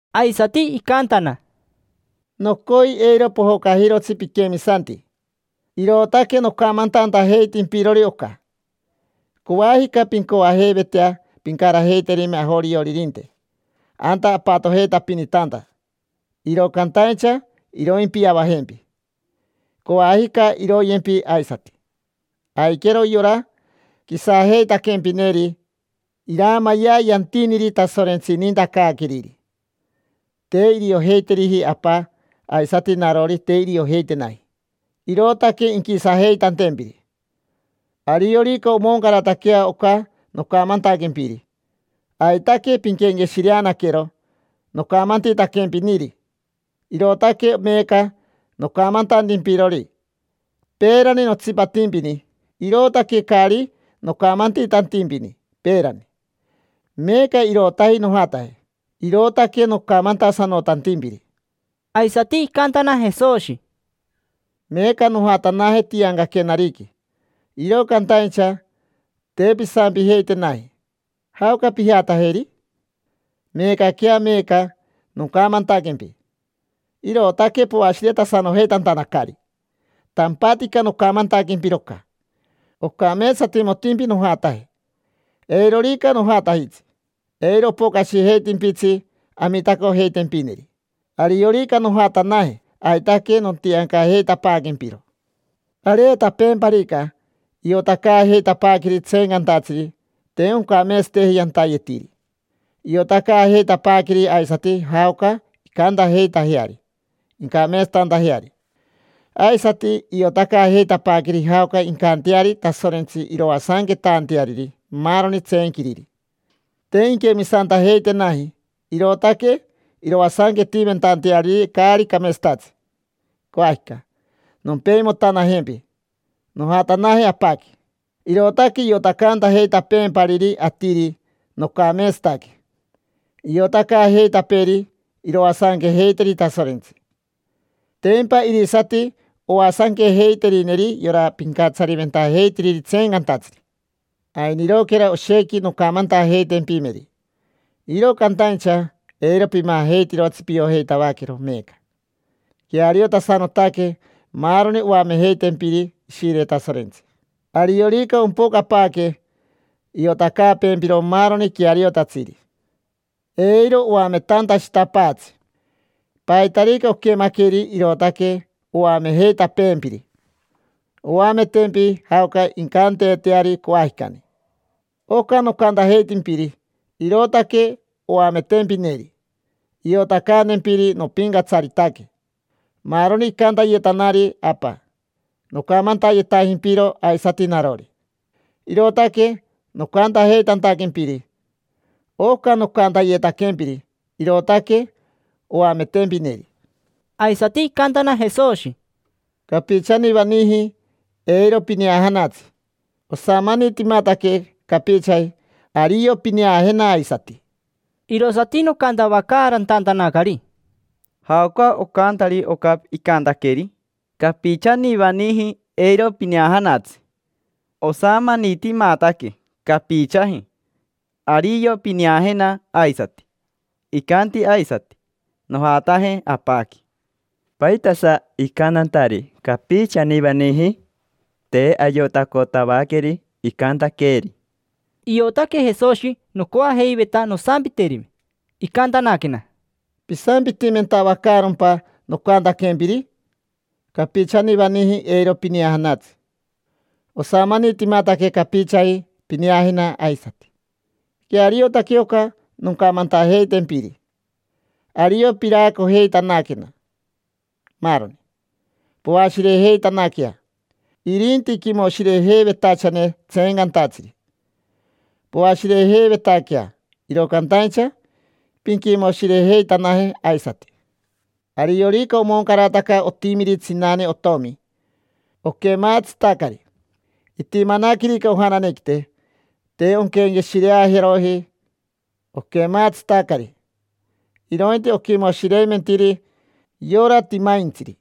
Aisati icantana: —Nocoi eiro pojocajirotsi piquemisanti, irootaque nocamantantajeitimpirori oca. Coajica pincoajeivetea pincarajeiterime ajorioririnte anta apatojeitapinitanta, iro cantaincha iroimpiavajempi. Coajica iroyempi aisati. Aiquero yora quisajeitaquempineri iraamayea yantiniri Tasorentsi inintacaaqueriri. Te iriojeiteriji Apa, aisati narori te iriojeitenaji, irootaque inquisajeitantempiri. Ariorica omoncarataquea oca nocamantaquempiri, aitaque pinquenqueshireanaquero nocamantitaquempiniri, irootaque meeca nocamantantimpirori. Peerani notsipatimpini, irootaque caari nocamantitantimpini peerani, meecari meeca irootaji nojataje, irootaque nocamantasanotantimpiri. Aisati icantana Jesoshi: —Meeca nojatanaje tiancaquenariqui. Iro cantaincha te pisampijeitenaji: “¿Jaoca pijatajeri?” Meecaquea, meeca, nocamantaquempi, irootaque poashiretasanojeitantanacari. Tampatica nocamantaquempiro oca. Ocameetsatimotimpi nojataje. Eirorica nojatajitsi, eiro opocashijeitimpitsi Amitacojeitempineri. Ariorica nojatanaje, aitaque nontiancajeitapaaquempiro. Areetapeemparica, iotacaajeitapaaqueri tseencantatsiri te oncameetsateji yantayetiri. Iotacaajeitapaaqueri aisati jaoca incantajeitajeari incameetsatantajeari. Aisati iotacaajeitapaaqueri jaoca incanteari Tasorentsi iroasanquetanteariri maaroni tseenquiriri. Te inquemisantajeitenaji, irootaque iroasanquetimentanteariri caari cameetsatatsi. Coajica nompeimotanajempi, nojatanaje Apaqui, irootaque iotacantajeitapeempariri atiri nocameetsataque. Iotacaajeitapeeri iroasanquejeiteri Tasorentsi. Tempa irisati oasanquejeiterineri yora pincatsariventajeitiriri tseencantatsiri. Ainiroquera oshequi noncamantajeitempimeri, iro cantaincha eiro pimajeitirotsi piojeitavaquero meeca. Queariotasanotaque maaroni oamejeitempiri Ishire Tasorentsi. Ariorica ompocapaaque, iotacaapeempiro maaroni queariotatsiri. Eiro oametantashitapaatsi. Paitarica oquemaqueri irootaque oamejeitapeempiri. Oametempi jaoca incanteeteari coajicani. Oca nocantajeitimpiri, irootaque oametempineri; iotacantempiri nopincatsaritaque. Maaroni icantayetanari Apa, nocamantayetajimpiro aisati narori, irootaque nocantajeitantaquempiri: “Oca nocantayetaquempiri, irootaque oametempineri”. Aisati icantana Jesoshi: —Capichanivaniji eiro pineajanatsi. Osamanitimataque capichaji, ario pineajena aisati. Irosati nocantavacaarantantanacari: —¿Jaoca ocantari oca icantaqueeri? “Capichanivaniji eiro pineajanatsi. Osamanitimataque capichaji, ario pineajena aisati”. Icanti aisati: “Nojataje Apaqui”. ¿Paitasa icantantari: “Capichanivaniji”? Te ayotacotavaqueri icantaqueeri. Iotaque Jesoshi nocoajeiveta nosampiterime. Icantanaquena: —¿Pisampitimentavacaarompa nocantaquempiri? “Capichanivaniji eiro pineajanatsi. Osamanitimataque capichaji pineajena aisati”. Queariotaque oca noncamantajeitempiri. Ario piraacojeitanaquena, maaroni, poashirejeitanaquea. Irinti quimoshirejeivetachane tseencantatsiri. Poashirejeivetaquea, iro cantaincha pinquimoshirejeitanaje aisati. Ariorica omoncarataca otimiri tsinane otomi, oquemaatsitacari. Itimanaquerica ojananequite, te onquenqueshireajeroji oquemaatsitacari, irointi oquimoshireimentiri yora timaintsiri.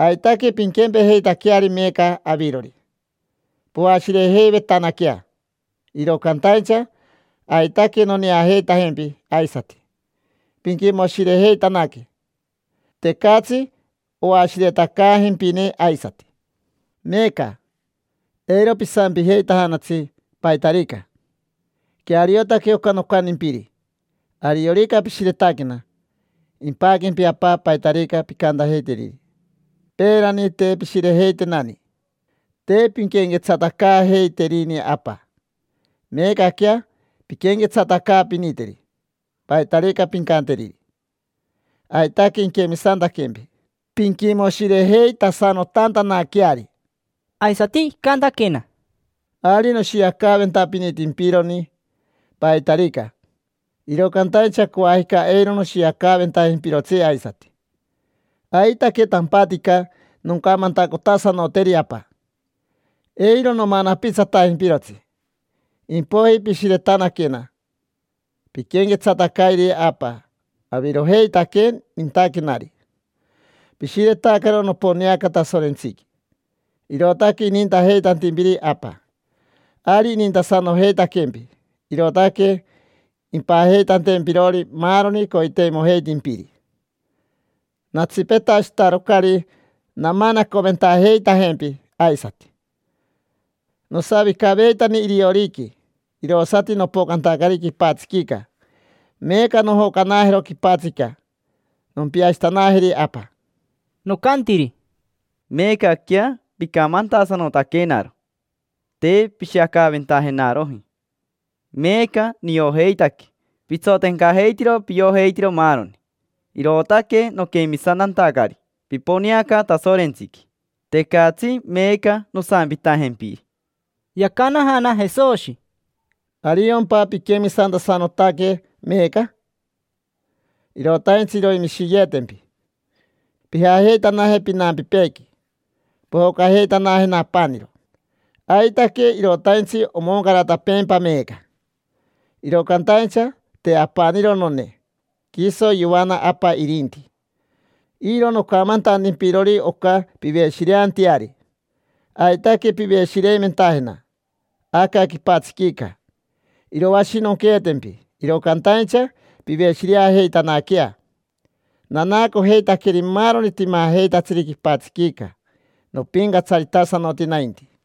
Aitaque pinquempejeitaqueari meeca avirori, poashirejeivetanaquea. Iro cantaincha aitaque noneajeitajempi aisati. Pinquimoshirejeitanaque, tecatsi oashiretacaajempine aisati. Meeca, eiro pisampijeitajanatsi paitarica. Queariotaque oca nocantimpiri. Ariorica pishiretaquena, impaquempi Apa paitarica pincantajeiteriri. Peerani te pishirejeitenani, te pinquenquetsatacaajeiterini Apa. Meecaquea pinquenquetsatacaapiniteri. Paitarica pincanteriri, aitaque inquemisantaquempi, pinquimoshirejeitasanotantanaqueari. Aisati icantaquena: —Ari noshiacaventapinitimpironi paitarica, iro cantaincha coajica eiro noshiacaventajimpirotsi aisati. Aitaque tampatica noncamantacotasanoteri Apa, eiro nomanapitsatajimpirotsi. Impoiji pishiretanaquena, pinquenquetsatacayeri Apa. Avirojeitaque nintaquenari. Pishiretacaro noponeaca Tasorentsiqui, irootaque inintajeitantimpiri Apa. Ari inintasanojeitaquempi, irootaque impajeitantempirori maaroni coiteimojeitimpiri. Natsipetashitarocari namanacoventajeitajempi aisati. Nosavicaveitani irioriqui, irosati nopocantacari quipatsiquica. Meeca nojocanajero quipatsica, nompiashitanajeri Apa. Nocantiri: —Meecaquea picamantasanotaquenaro. Te pishiacaventajenaroji. Meeca niojeitaque pitsotencajeitiro piojeitiro maaroni, irootaque noquemisantantacari piponeaca Tasorentsiqui. Tecatsi meeca nosampitajempiri. Yacanajana Jesoshi: —¿Ariompa piquemisantasanotaque meeca? Irotaintsi iroimishiyeetempi, pijajeitanaje pinampipeequi. Pojocajeitanajena apaniro. Aitaque irotaintsi omoncaratapeempa meeca. Iro cantaincha te apaniro none, quiso yoana Apa irinti. Iro nocamantantimpirori oca piveshireanteari. Aitaque piveshireimentajena. Aca quipatsiquica iroashinonqueetempi, iro cantaincha piveshireajeitanaquea. Nanaacojeitaqueri maaroni timajeitatsiri quipatsiquica, nopincatsaritasanoti nainti.